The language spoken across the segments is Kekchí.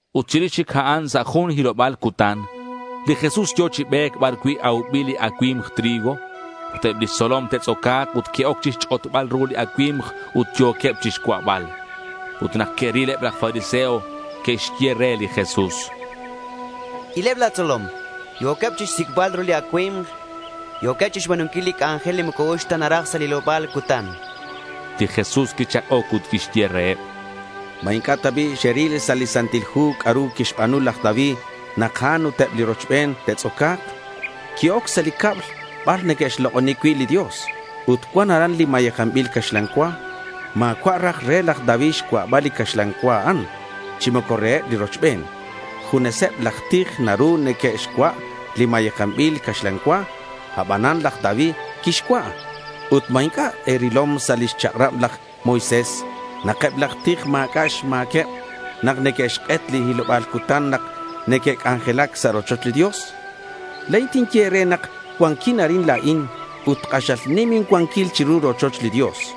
Ut chirix chic a'an sa' jun hiloba̱l cutan, li Jesús yo̱ chi be̱c bar cui' aubil li acui̱mk trigo. Ut eb lix tzolom te'tz'oca̱k ut que'oc chixch'otbal ru li acui̱mk ut yo̱queb chixcua'bal. Ut nak que'ril eb laj fariseo, que'xye re li Jesús: —Ileb la̱ tzolom. Yo̱queb chixsic'bal ru li acui̱mk. Yo̱queb chixba̱nunquil li c'anjel moco uxc ta naraj sa' li hiloba̱l cutan, chanqueb. Li Jesús quichak'oc ut quixye reheb: —¿Ma inc'a' ta bi' xeril sa' li Santil Hu c'a'ru quixba̱nu laj David nak a'an ut eb li rochben te'tz'oca̱k? Qui-oc sa' li cab bar neque'xlok'oni cui' li Dios ut cuan aran li mayejanbil caxlan cua. Ma̱cua' raj re laj David xcua'bal li caxlan cua a'an, chi moco reheb li rochben. Juneseb laj tij naru neque'xcua' li mayejanbil caxlan cua. Abanan laj David quixcua'. Ut, ¿ma inc'a' e̱rilom sa' lix chak'rab laj Moisés nak eb laj tij ma̱c'a' xma̱queb nak neque'xk'et li hiloba̱l cutan nak neque'c'anjelac sa' rochoch li Dios? La̱in tinye e̱re nak cuanquin arin la̱in, ut k'axal nim incuanquil chiru li rochoch li Dios.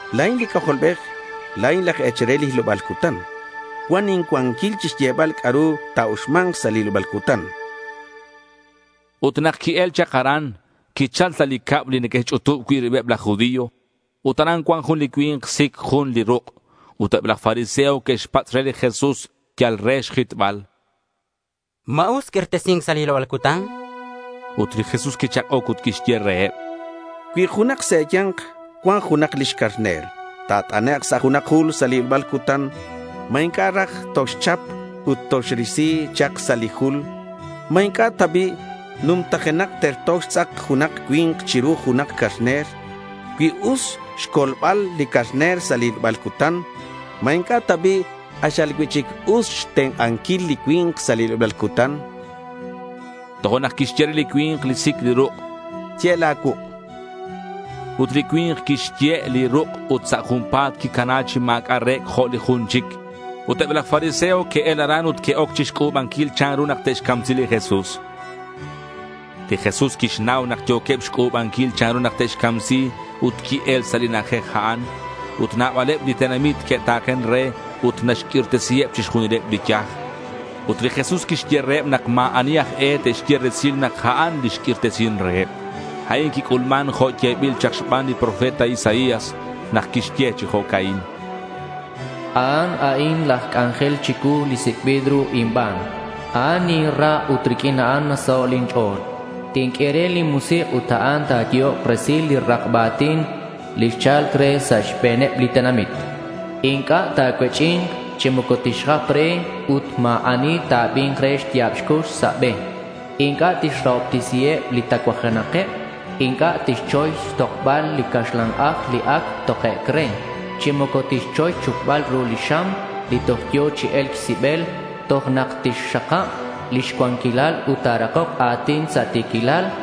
La̱in li C'ajolbej. La̱in laj e̱chal re li hiloba̱l cutan. Cuan incuanquil chixyebal c'a'ru ta̱uxma̱nk sa' li hiloba̱l cutan, chan li Jesús. Ut nak qui-el chak aran, quichal sa' li cab li neque'xch'utub cui' ribeb laj judío. Ut aran cuan jun li cui̱nk sic jun li ruk'. Ut eb laj fariseo que'xpatz' re li Jesús yal re xjitbal: —¿Ma us q'uirtesi̱nc sa' li hiloba̱l cutan? Ut li Jesús quichak'oc ut quixye reheb: —Cui junak sa' e̱ya̱nk cuan junak lix carner ta̱t'anek' sa' junak jul sa' li hiloba̱l cutan, ¿ma inc'a' raj toxchap ut toxrisi chak sa' li jul? ¿Ma inc'a' ta bi' numtajenak terto xtz'ak junak cui̱nk chiru junak carner? Cui us xcolbal li carner sa' li hiloba̱l cutan, ¿ma inc'a' ta bi' k'axal cui'chic us xtenk'anquil li cui̱nk sa' li hiloba̱l cutan?— Tojo'nak quixye re li cui̱nk li sic li ruk': —Ye' la̱ cuuk', chan re. Ut li cui̱nk quixye' li ruk' ut sa' junpa̱t quicana chi ma̱c'a' re̱c' jo' li jun chic. Ut eb laj fariseo que'el aran ut que'oc chixc'u̱banquil chanru nak te'xcamsi li Jesús. Li Jesús quixnau nak yo̱queb xc'u̱banquil chanru nak te'xcamsi ut qui-el sa' li na'ajej a'an. Ut nabaleb li tenamit que'ta̱ken re ut naxq'uirtesiheb chixjunileb li yaj. Ut li Jesús quixye reheb nak ma̱ ani aj e te'xye resil nak a'an li xq'uirtesin reheb. A'in quic'ulman jo' yebil chak xban li profeta Isaías nak quixye chi jo'ca'in: A'an a'in laj c'anjel chicuu, li sic'bil ru inban. A'an ninra ut riq'uin a'an nasaho' lin ch'o̱l. Tinq'ue re lin musik', ut a'an ta̱yehok resil li rakba a̱tin li cha̱lc re sa' xbe̱neb li tenamit. Inc'a' ta̱cuech'i̱nk chi moco tixjap re ut ma̱ ani ta̱abi̱nk re lix ya̱b xcux sa' be. Inc'a' tixrahobtesiheb li tacuajenakeb. Inc'a' tixchoy xtokbal li caxlan aj li ac tokec' re, chi moco tixchoy xchupbal ru li xam li toj yo̱ chi e̱lc xsibel toj nak tixxakab lix cuanquil ut ta̱rakok a̱tin sa' ti̱quilal.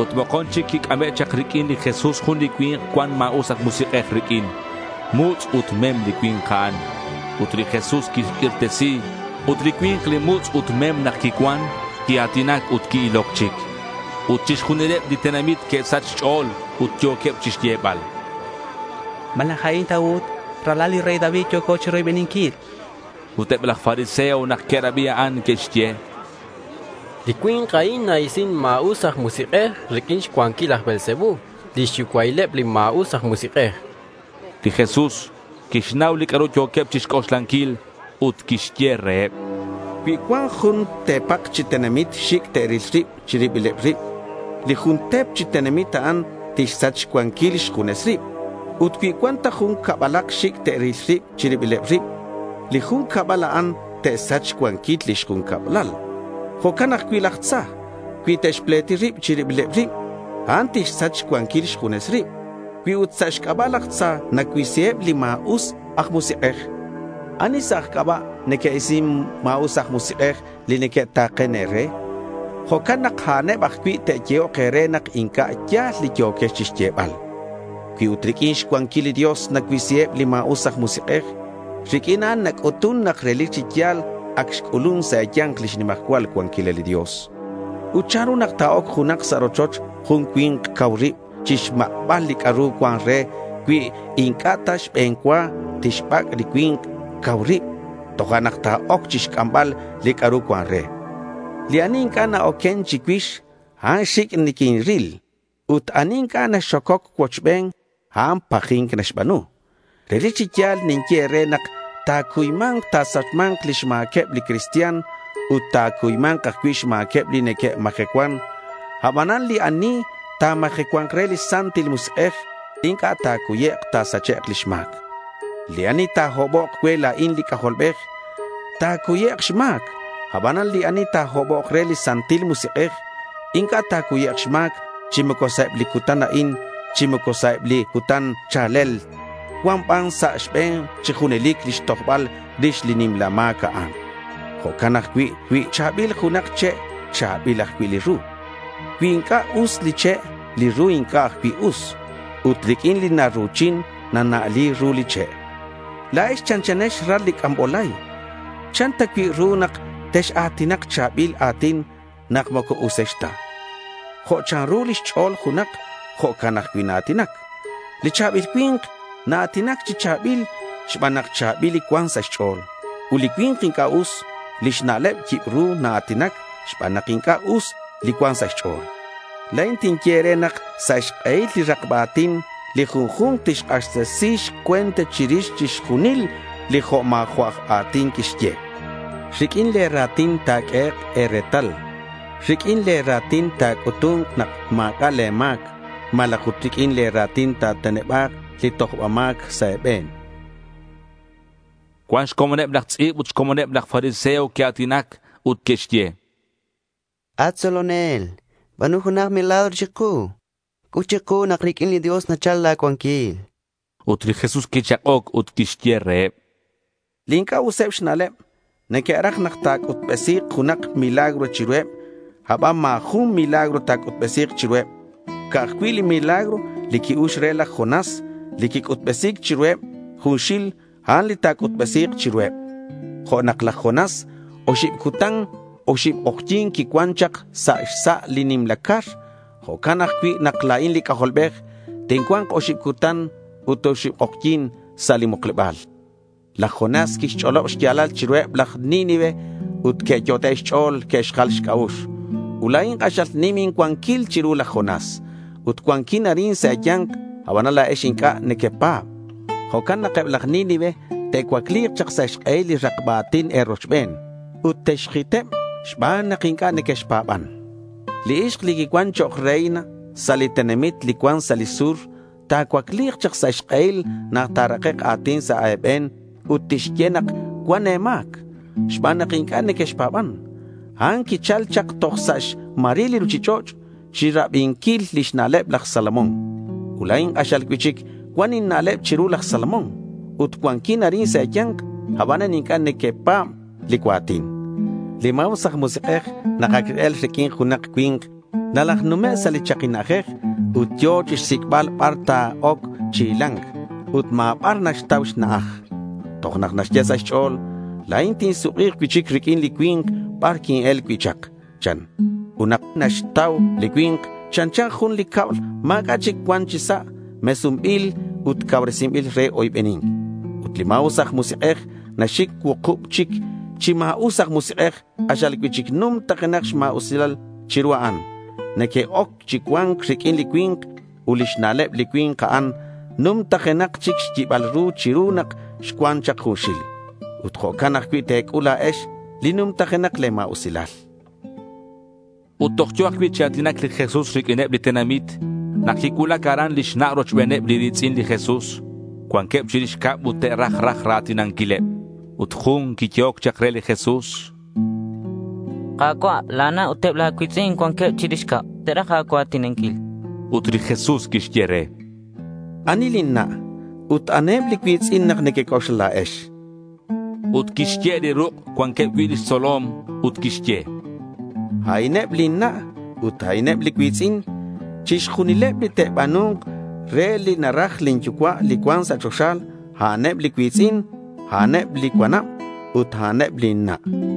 Ut mokon chic quic'ame' chak riq'uin li Jesús jun li cui̱nk cuan ma̱us aj musik'ej riq'uin. Mutz' ut mem li cui̱nk a'an. Ut li Jesús quixq'uirtesi, ut li cui̱nk li mutz' ut mem nak quicuan, quia̱tinac ut qui-iloc chic. Ut chixjunileb li tenamit que'sach xch'o̱l ut yo̱queb chixyebal: —¿Malaj a'in ta ut ralal li rey David, li yo̱co chiroybeninquil? Ut eb laj fariseo nak que'rabi a'an, que'xye: —Li cui̱nk a'in na-isin ma̱us aj musik'ej riq'uin xcuanquil laj Beelsebú, lix yucua'ileb li ma̱us aj musik'ej, chanqueb. Li Jesús quixnau li c'a'ru yo̱queb chixc'oxlanquil ut quixye reheb: —Cui cuan jun te̱pak chi tenamit xic' te'ril rib chi ribileb rib, li jun te̱p chi tenamit a'an tixsach xcuanquil xjunes rib. Ut cui cuan ta jun cabalak xic' te'ril rib chi ribileb rib, li jun cabal a'an te'xsach xcuanquil lix jun cablal. Jo'can ajcui' laj tza cui te'xpleti rib chi ribileb rib, a'an tixsach xcuanquil xjunes rib. Cui ut sa' xc'aba' laj tza nacuisiheb li ma̱us aj musik'ej, ¿ani sa' aj c'aba' neque'isin ma̱us aj musik'ej li neque'ta̱ken e̱re? Jo'can nak a'aneb ajcui' te'yehok re nak inc'a' ya̱l li yo̱quex chixyebal. Cui ut riq'uin xcuanquil li Dios nacuisiheb li ma̱us aj musik'ej, riq'uin a'an nac'utun nak relic chi ya̱l ac xc'ulun sa' e̱ya̱nk lix nimajcual cuanquilal li Dios. Ut chanru nak ta̱oc junak sa' rochoch jun cui̱nk cau rib chixmak'bal li c'a'ru cuan re cui inc'a' ta xbe̱n cua tixbac' li cui̱nk cau rib, tojo'nak ta̱oc chixc'ambal li c'a'ru cuan re. Li ani inc'a' na-oquen chicuix, a'an xic' niquinril. Ut ani inc'a' naxococ cuochben, a'an paji̱nc naxba̱nu. Relic chi ya̱l ninye e̱re nak ta̱cuyma̱nk ta̱sachma̱nk lix ma̱queb li cristian ut ta̱cuyma̱nk ajcui' xma̱queb li neque'majecuan. Abanan li ani ta̱majecua̱nk re li Santil Musik'ej, inc'a' ta̱cuyek' ta̱sachek' lix ma̱c. Li ani ta̱hobok cue la̱in, li C'ajolbej, ta̱cuyek' xma̱c; abanan li ani ta̱hobok re li Santil Musik'ej inc'a' ta̱cuyek' xma̱c chi moco sa' eb li cutan a'in, chi moco sa' eb li cutan cha̱lel. Cua̱nk ban sa' xbe̱n chi junelic lix tojbal rix li nimla ma̱c a'an. Jo'can ajcui' cui cha̱bil junak che', cha̱bil ajcui' li ru. Cui inc'a' us li che', li ru inc'a' ajcui' us. Ut riq'uin li naru̱chin, nana'li ru li che'. ¡La̱ex chanchanex ral li c'ambolay! ¿Chan ta cui' ru nak tex-a̱tinak cha̱bil a̱tin nak moco usex ta? Jo' chanru lix ch'o̱l junak, jo'can ajcui' naa̱tinac. Li cha̱bil cui̱nk naa̱tinac chi cha̱bil xban nak cha̱bil li cuan sa' xch'o̱l. Ut li cui̱nk li inc'a' us lix na'leb, yibru naa̱tinac xban nak inc'a' us li cuan sa' xch'o̱l. La̱in tinye e̱re nak sa' xk'ehil li rakba a̱tin li junju̱nk tixk'axtesi xcue̱nt chirix chixjunil li jo' ma̱jo'il aj a̱tin quixye. Riq'uin le̱ ra̱tin ta̱q'uehek' e̱retal. Riq'uin le̱ ra̱tin ta̱c'utu̱nk nak ma̱c'a' le̱ ma̱c malaj riq'uin le̱ ra̱tin ta̱teneba̱k li tojbal ma̱c sa' e̱be̱n.— Cuan xcomoneb laj tz'i̱b ut xcomoneb laj fariseo que'a̱tinac ut que'xye: —At tzolonel, ba̱nu junak milagro chiku. C'ut chiku nak riq'uin li Dios nachal la̱ cuanquil, chanqueb. Ut li Jesús quichak'oc ut quixye reheb: —Li inc'a' useb xna'leb neque'raj nak ta̱c'utbesi̱k junak milagro chiruheb, aban ma̱ jun milagro ta̱c'utbesi̱k chiruheb. Ca'aj cui' li milagro li qui-ux re laj Jonás, li quic'utbesi̱c chiruheb junxil, a'an li ta̱c'utbesima̱nk chiruheb. Jo' nak laj Jonás oxib cutan ut oxib k'ojyi̱n quicuan chak sa' xsa' li nimla car, jo'can ajcui' nak la̱in li C'ajolbej tincua̱nk oxib cutan ut oxib k'ojyi̱n sa' li mukleba̱l. Laj Jonás quixch'olob xya̱lal chiruheb laj Nínive ut que'yot'e' xch'o̱l que'xjal xc'a'ux. Ut la̱in k'axal nim incuanquil chiru laj Jonás ut cuanquin arin sa' e̱ya̱nk, abanan la̱ex inc'a' niquine̱pa̱b. Jo'can nak eb laj Nínive te'cuacli̱k chak sa' xk'ehil li rakba a̱tin e̱rochben ut texjiteb xban nak inc'a' nequexpa̱ban. Li ixk li quicuan chok' reina sa' li tenamit li cuan sa' li sur ta̱cuacli̱k chak sa' xk'ehil nak ta̱rakek' a̱tin sa' e̱be̱n ut tixye nak cuan e̱ma̱c xban nak inc'a' nequexpa̱ban. A'an quichal chak toj sa' xmaril li ruchich'och' chirabinquil lix na'leb laj Salomón. Ut la̱in k'axal cui'chic cuan inna'leb chiru laj Salomón ut cuanquin arin sa' e̱ya̱nk. Abanan inc'a' nequepa̱b li cua̱tin. Li ma̱us aj musik'ej nak ac x-el riq'uin junak cui̱nk, nalajnume' sa' li chaki na'ajej ut yo̱ chixsic'bal bar ta̱oc chi hila̱nc. Ut ma̱ bar naxtau xna'aj. Tojo'nak naxye sa' xch'o̱l: —La̱in tinsuk'i̱k cui'chic riq'uin li cui̱nk bar quin-el cui' chak, chan. Ut nak nocoxtau li cui̱nk, chanchan jun li cab ma̱c'a' chic cuan chi sa', mesunbil ut cauresinbil re oybeni̱nc. Ut li ma̱us aj musik'ej naxsic' cuukub chic chi ma̱us aj musik'ej k'axal cui'chic numtajenak xma̱usilaleb chiru a'an. Neque'oc chi cua̱nc riq'uin li cui̱nk. Ut lix na'leb li cui̱nk a'an numtajenakak chic xyibal ru chiru nak xcuan chak junxil. Ut jo'can ajcui' te̱c'ul la̱ex li numtajenak le̱ ma̱usilal. Ut toj yo̱ ajcui' chi a̱tinac li Jesús riq'uineb li tenamit nak quicuulac aran lix na' rochbeneb li ri̱tz'in li Jesús. Cuanqueb chirix cab ut te'raj raj ra̱tinanquileb. Ut jun quiyehoc chak re li Jesús: —Ka̱cua', la̱ na' ut eb la̱ cui̱tz'in cuanqueb chirix cab. Te'raj a̱cua̱tinanquil. Ut li Jesús quixye re: —¿Ani lin na' ut aniheb li cui̱tz'in nak nequec'oxla la̱ex?— Ut quixye' li ruk' cuanqueb cui' lix tzolom ut quixye: —A'ineb lin na' ut a'ineb li cui̱tz'in. Chixjunileb li te'ba̱nu̱nk re li naraj lin Yucua' li cuan sa' choxa, a'aneb li cui̱tz'in, a'aneb li cuanab ut a'aneb lin na', chan.